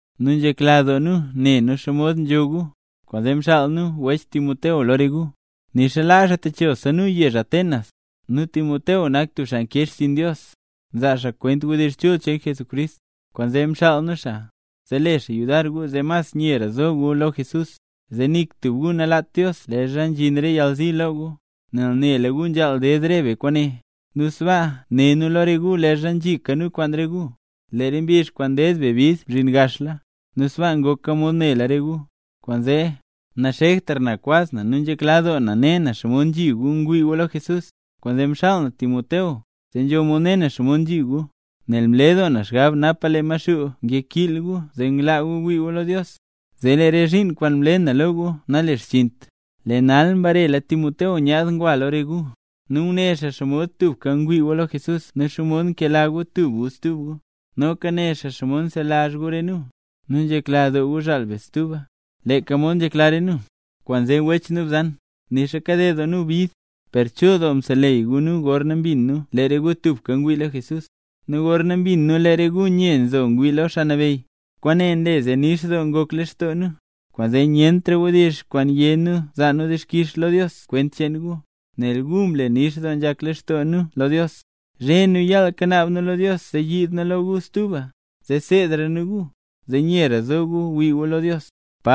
Nu nzhekla doo nu ne nu nen xomod nzho gu, kwaanzee mxaal nu wech Timoteo lo re gu, nixa laa xaa techo nu yezh Atenas. Nu Timoteo nak tub xaa nkee xchiin Dios, nzaa xaa kwent wdizh chul cheen Jesucrist. Kwaanzee mxaal nu xaa, zee le xaa yudar gu zee mas nyera zo gu lo Jesús, zee nik tub gu nalaat Dios leezha nzhin re yalzi lo gu. Nel nela gu nzhaal ded re be kwaane. Nu sbaa né nu lo re gu leezha nzhika nu kwaan re gu, lee re mbizh kwaan ded be bid mzhin gaxla, nu sbaa ngoka mod nela re gu. Kwaanzee, naxektra na kwaz na nu nzhekla doo na ne na xomod nzhi gu ngwii gu lo Jesús, kwaanzee mxaal na Timoteo, zee nzho mod ne na xomod nzhi gu. Nel mle doo na xgab napa lee Maxuu ngkiil gu zee nglaa gu wii gu lo Dios, zee lee re zhiin kwaan mle na lo gu nalexchiint. Lee nal mbarela Timoteo nyaad ngwa lo re gu, nu nguné xaa nen xomod tubka ngwii gu lo Jesús nu xomod nkela gu tub gu stub gu. Noka né xaa nen xomod nselazh gu re nu, nu nzhekla doo gu zhaal be stuba, leeka mod nzhekla re nu. Kwaanzee wech nu bzan, nixa kaded doo nu bid, per chul doo mseleyy gu re nu gorna mbin nu lee re gu tubka ngwii lo Jesús. Nu gorna mbin nu lee re gu nye nzo ngwii lo Xaa Nabeyy, kwaane nle zee nix doo ngok lextoo nu. Kwaanzee nyentra wdizh kwaan yé nu nzaa nu dixkix lo Dios kwent cheen gu, nel gu mle nix doo nzhak lextoo nu lo Dios. Zhe nu yaal kanaab nu lo Dios zee yiid nu lo re gu stuba, zee seedra nu gu, zee nyera zo gu wii gu lo Dios.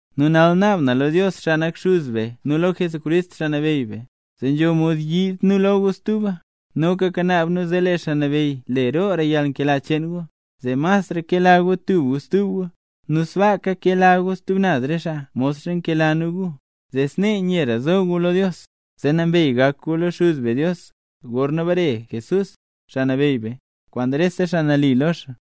Nu nal naab na lo Dios, xaa nak Xuz be nu lo Jesucrist, Xaa Nabeyy be, zee nzho mod yiid nu lo gu stuba. Noka kanaab nu zee lee Xaa Nabeyy le roora yalnkela cheen gu, zee masra kela gu tub gu stub gu, nu sbaaka kela gu stub naz re xaa, modxa nkela nu gu, zee snee nyera zo gu lo Dios, zee nambey gak gu lo Xuz be Dios, gorna bare Jesús, Xaa Nabeyy be, kwaan rese xaa nali lo xaa.